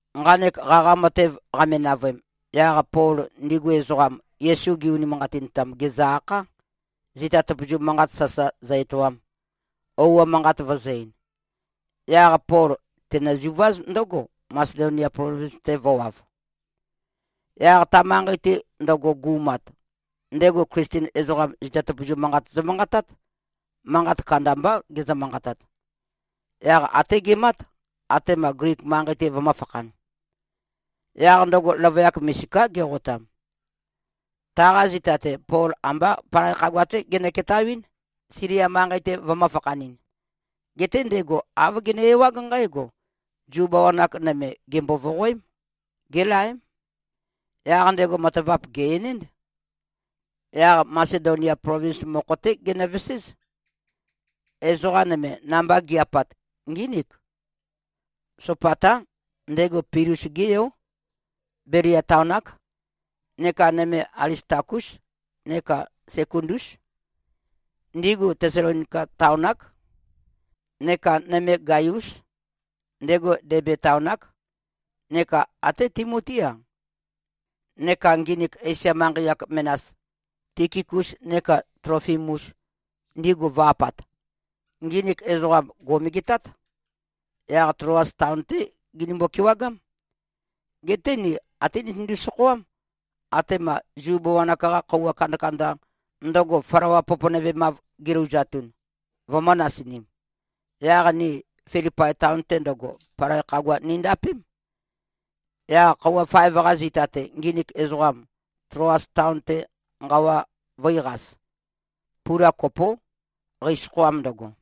Nqanek qaqa matev qame-navøem, yaq Pol ndigu ezoqam, Yesu gi-unimanqatintam, gèzø-akhá, zita tøpøzu manqat sasa zø-etoam, ouo manqat vøzø̄-ein. Yaq Pol tenøzuváz ndǿgo, Masedonia plovins-te vø̄wav. Yaq ta manqei-te ndøgo gu꞉mat, ndego Klisten ezoqam, zita tøpøzu manqat zømanqatát. Manqat kandambá gezø-manqatat. Yaq até gemát, atema Glik manqei-te vømø̄fakhan. Yaq ndøgo løvøyak misiká, geqotam. Taqa zita-te, Pol ambá palai khagua-té genøketawɨ́n, Silia manqei-te vømø̄-fakhanɨn. Geté ndego āv gene-ewág nqǽgo: Zu bawan-ak nøme gèmbo-voqoém. Gélaém. Yaq ndego matavap gè-enénd. Yaq Masedonia plovins mokho-té genøveséz. Ezoqa nøme, namba gi꞉-apat, ngínik: Sopatá. Ndego Pilus-gé yó. Belia taon-ák. Neka nøme Alistakús neka Sekundús. Ndigu Tesalonika taon-ák. Neka nøme Gaiús. Ndego Debe taon-ák. Neka até Timotí-a, neka nginik Esia manqei-ak menas, Tikikus neka Tlofimus, ndigu vø̄-apat. Nginik ezoqam, gò꞉megetát. Yaq Tloas taon-té ginimbo-kewagám. Geté ni até nitøndu-sokhoám, atema Zu bawan-ak-qa khøuwa kandakanda, ndøgo flawa poponøvemav gilouzatun, vømø̄-nasinim. Yaq ni Filipai taon-te ndøgo, palai khagua nindapém. Yaq khøuwa faev-qa zita-te, nginik ezoqam, Tloas taon-te nqawa vø̄iqas. Pula kopó, qeisokhoam ndøgo.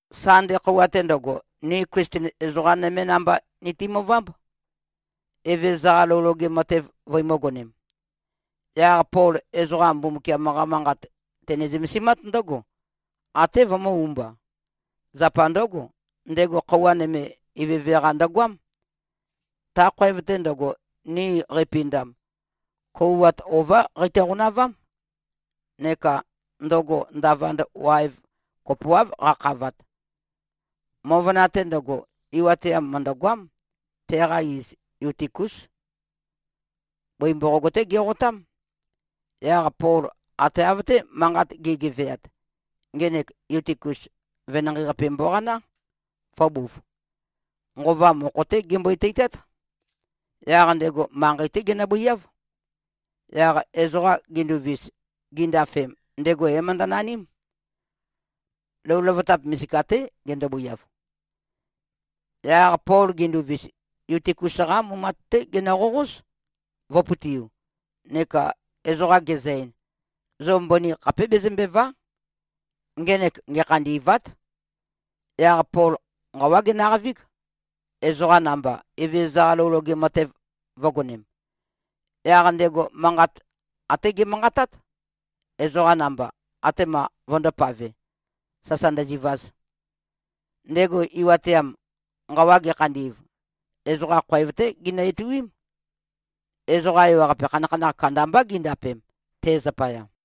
Sande khøuwa-te ndøgo, ni Klisten ezoqa nømé namba nitimøvámb, Evezøza-qa lou loge matev vøimǿgonēm. Yaq Pol ezoqa Mbumbukiam-qa Manqat tene-zømesimát ndǿgo, até vømø̄-umba. Zapa ndǿgo, ndego khøuwa nøme, ivøve-qa ndøgoám. Ta khoev-te ndøgo, ni qeipindam, kouwat ová qeito-qonavám. Neka ndøgo ndavand waev kopoáv qakhavat. Møvøna-te ndøgo, iwateam mø̀ndøgoám. Teqa iz Yutikus. Bøi mboqog-té geqotám. Yaq Pol ate av-té manqat ge꞉geveat, ngenek Yutikus venanqei-qape mboqaná, vø̄buv. Nqova mokho-té gembøi-teitát. Yaq ndego manqei-té genøbøiáv. Yaq ezoqa ginduvis, gindafem, ndego é-møndønaním. Lou løvøtap misika-té gendobøiav. Yaq Pol gendovis, Yutikus-qá mumat-té genøqoqóz, vø̄pøtiu, neka ezoqa gezø-ein, “Zo mbøni khapé bezømbèva᷄. Ngenek ngekhandî꞉vát.” Yaq Pol nqawá genøqavíg, ezoqa namba Evezøza-qa lou loge matev vø̄gonem. Yaq ndego manqat até gemanqatát, ezoqam namba, atema꞉ vøndōpave, sasa ndøzivaz. Ndego iwateam, nqawa gekhandi꞉v, ezoqa khoev-té ginø-ituím. Ezoqa ewaqape, khanakhanakh kandambá gindapem, te zapaya.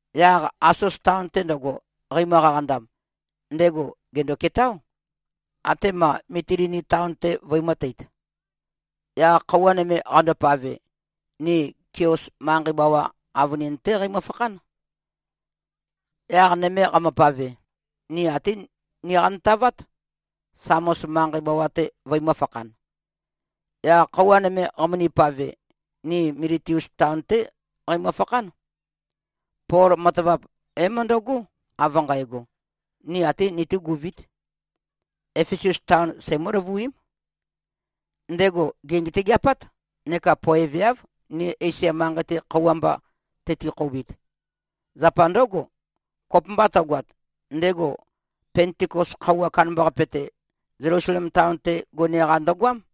Yaq Asos taon-te ndøgo, qeimø-qaqandam, ndego gèndo-ketáo, atema Mitilini taon-te, vøimø̄teit. Yaq khøuwa nøme qandopave, ni Kios manqei bawa avønin-té qeimø-fakhán. Yaq nøme qamøpave, ni ate niqantavát, Samos manqei bawa-te vøimø̄-fakhan. Yaq khøuwa nøme qamøni-pave, ni Miletus taon-té qeimø-fakhán. Pol matavap é-møndøgó, av nqægo, ni até nitúguvít. Efesus taon seimǿ-løvuím. Ndego gè꞉ngetøgeapát neka poeveáv, ni Esia manqei-te, khøuwa mba tøti-khoubit. Zapa ndǿgo, kopømba tøgoat, ndego Pentikos khøuwa kandambaqape-te, Zelusalem taon-te gone-qa ndøgoám.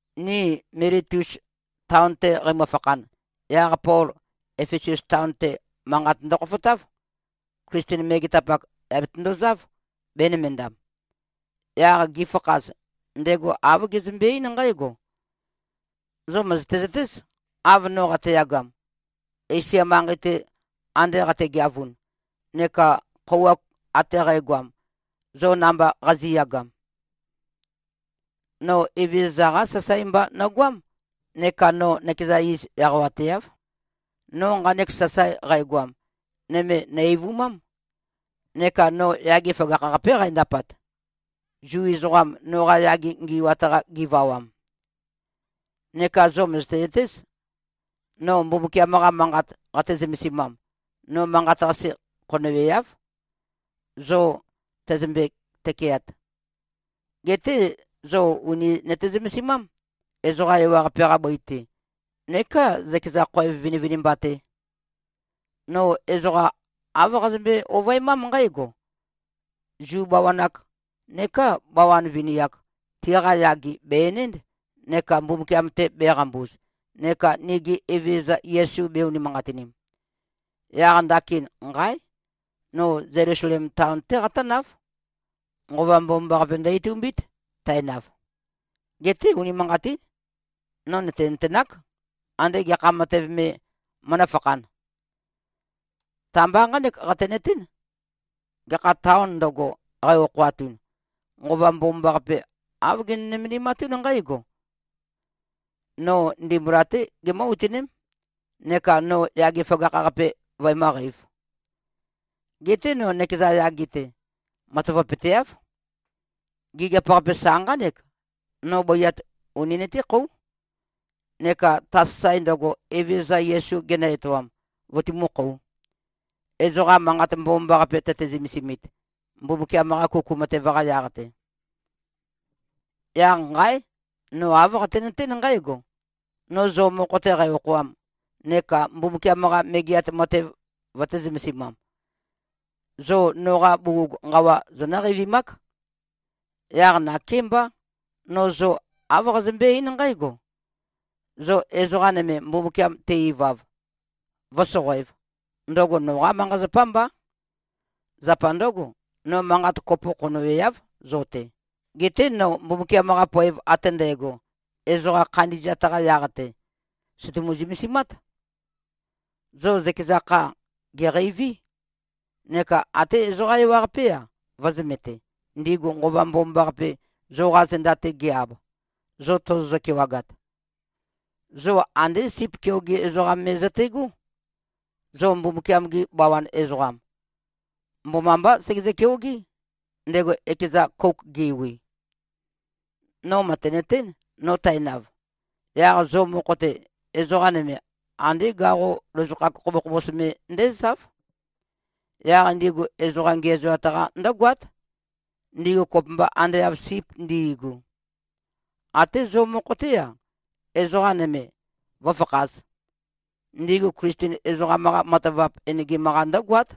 Ni Miletus taon-te qeimø-fakhan, yaq Pol Efesus taon-te, manqat ndøkhofotáv. Klisten megetapak, yà betøndozáv, bēnømendam. Yaq gifakhaz, ndego āv gezømbe-eín nqǽgo, “Zo mø̀zøte-zøtéz, av no qateyagam, Esia manqei-te ande qategeavun, neka khøuwa ate qægoam, zo namba qazi꞉yagam. No Evezøza-qá sasae mba nogoám neka no nøkeza iz eqawateáv. No nqanek sasae qægoam, nøme nø̀-eivumám. Neka no yage føgakh-qapé qændapat, Zu ezoqam, noqa yage ngi꞉wat-qa givawam. Neka zo mø̀zøte-zøtéz, no Mbumbukiam-qa Manqat qate-zømesimam, no manqat-qase khonøweáv, zo tøzømbe-tøkeat. Geté zo ùni nøte-zømesimám, ezoqa ewaqape-qa bøi-te neká zøkeza khoev vinivinimba-te. No ezoqa āv qazømbe-ovøemám nqǽgo: Zu bawan-ak neká bawan vini-ak, tiqa yage bè-enénd, neka Mbumbukiam-te bēqambuz neka nigi Evezøza Yesu bē-unimanqatinim. Yaq ndakin, nqáe! No Zelusalem taon-té qatǿnáv. Nqova Mbomambaqape ndø-itumbít, tænav. Geté, unimanqatín, no nø̀tenøtenák, ande gekha matev me mønǿfakhān. Ta-mba nqánek qatenøtén, gekha tāon ndøgo, qæ-okhoatun, Nqova Mbomambaqape āv gene-nømendimatún nqǽgo: No ndimbula-té gimǿ-utøném neka no yage føgakh-qape vøemǿqeīv. Geté no nøkeza yage-te, matavapøteáv. Gigiap-qape sa nqánek: No bøiat uni nøtékhóu, neka ta sasae ndøgo, Evezøza Yesu genø-etoam, vøtumú-khōu, ezoqa Manqat Mbomambaqape tøte-zømesimit, Mbumbukiam-qa kuku matev-qa yaq-te. Yaq nqáe! No āv qatenøtén nqǽgo: No zo mokho-te qæ-okhoam neka Mbumbukiam-qa Megeat Matev vøtē-zømesimam, zo noqa bugug nqawa zonǿ-qeivimák. Yaq nakémbá, no zo āv qazømbé-eín nqǽgo: Zo ezoqa nøme, Mbumbukiam te-ivav, vǿsoqoēv, ndøgo noqá manqa-zapá mbá. Zapa ndǿgo, no manqat kopo khonøweáv zo-te. Geté no Mbumbukiam-qa poev ate ndægo, ezoqa khandi꞉zat-qa yaq-te, sø̀tumu-zømesimát. Zo zøkeza kha, gèqeiví. Neka ate ezoqa ewaqapé-a, vø̄zømete, ndigu Nqova Mbomambaqape, zoqa zenda-te ge-ab, zo tozozø-kewagat. Zo andé sip keoge ezoqam me zøte꞉gó. Zo Mbumbukiam-gi bawan ezoqam, mbomambá segezø-keogé, ndego ekeza kouk ge꞉wi. No mø̀tenøtén, no tænav, yaq zo mokho-te, ezoqa nøme andé gaqo lozokhak khobokhobos me ndézáv. Yaq ndigu ezoqa ngiæzoat-qa ndǿgoát, ndigu kopømba ande av sip ndi꞉gu. Até zo mokho-té-a, ezoqa nøme vǿfakhāz. Ndigu Klisten ezoqam-qa matavap enegim-qa ndǿgoát.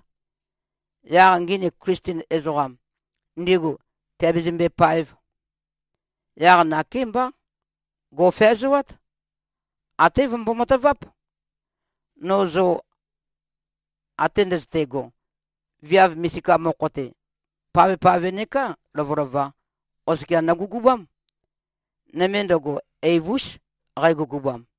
Yaq nginik Klisten ezoqam, ndigu tìabezømbe-páev. Yaq nakémbá. Gò꞉feazoát. Até vømbo-mataváp. No zo ate ndøzøte꞉go, viav misika mokho-te, pavpave neká lovølova, oskia nogugubám. Nøme ndøgo eiv-ús, qægugubam.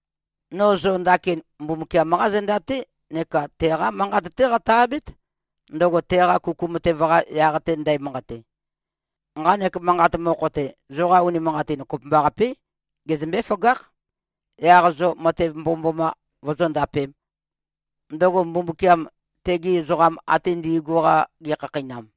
No zo ndakin Mbumbukiam-qá zenda-té neka teqá Manqat-té qatø-abét, ndøgo teqa kuku matev-qa yaq-te ndæmanqate. Nqanek manqat mokho-te, zoqa unimanqatin kopømbaqapé, gezømbé-føgákh, yaq zo matev mbomømboma vozóndapēm, ndøgo Mbumbukiam tegi ezoqam ate ndi꞉gu-qa gekhakheinam.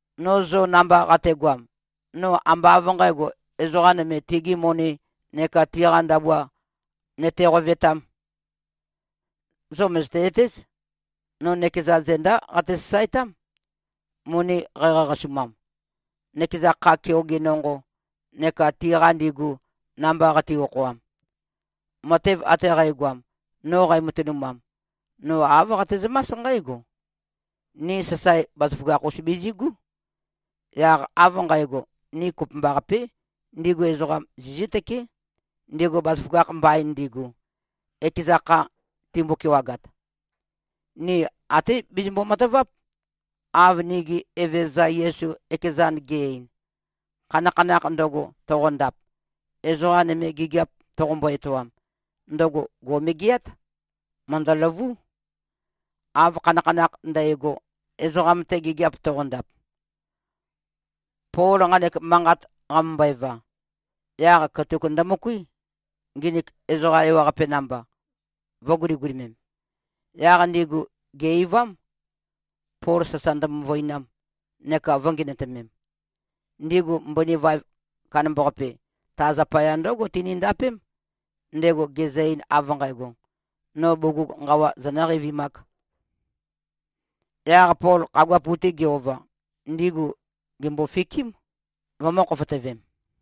No zo namba qategoam, no ambá av nqǣgo, ezoqa nøme tigi moni neka tiqa ndabua nøte-qovetām. Zo mø̀zøte-zøtéz, no nøkeza zendá qate-sasaetám, moni qæqaqasumam, nøkeza kha keoge nonqo neka tiqa ndigu, namba qati-okhoam. Matev ate qægoam, no qæmatønumam, no āv qatezømás nqǽgo: Ni sasae bazaføgakh-us bizigú. Yaq av nqægo, ni kopømbaqapé, ndigu ezoqam zizǿtøké, ndigu bazaføgakh mbain ndigu, ekeza kha timbo-kewagat. Ni até bizimbo-mataváp, av nigi Evezøza Yesu ekezan ge꞉-ein, ‘Khanakhanakh ndøgo, toqondap, ezoqa nøme gigiap toqombo-etoam, ndøgo gò꞉megeát. Mø̀ndøløvú, av khanakhanakh ndægo, ezoqam-te gigiap toqondap.’” Pol nqanek manqat qamømbøeva, yaq katuk ndømøkuí, nginik ezoqa ewaqape namba, vø̄guligulimem. Yaq ndigu gè-eivám, Pol sasa ndømøvøinam neka vø̄ngenøtømem. Ndigu mbøni vaev kandambaqape, ta zapaya ndǿgo tinindapém, ndego gezø-ein av nqægo, “No bugug nqawa zonǿ-qeivimák.” Yaq Pol khagua pu-te ge-ova, ndigu gèmbofikím, vømø̄-khofotøvem.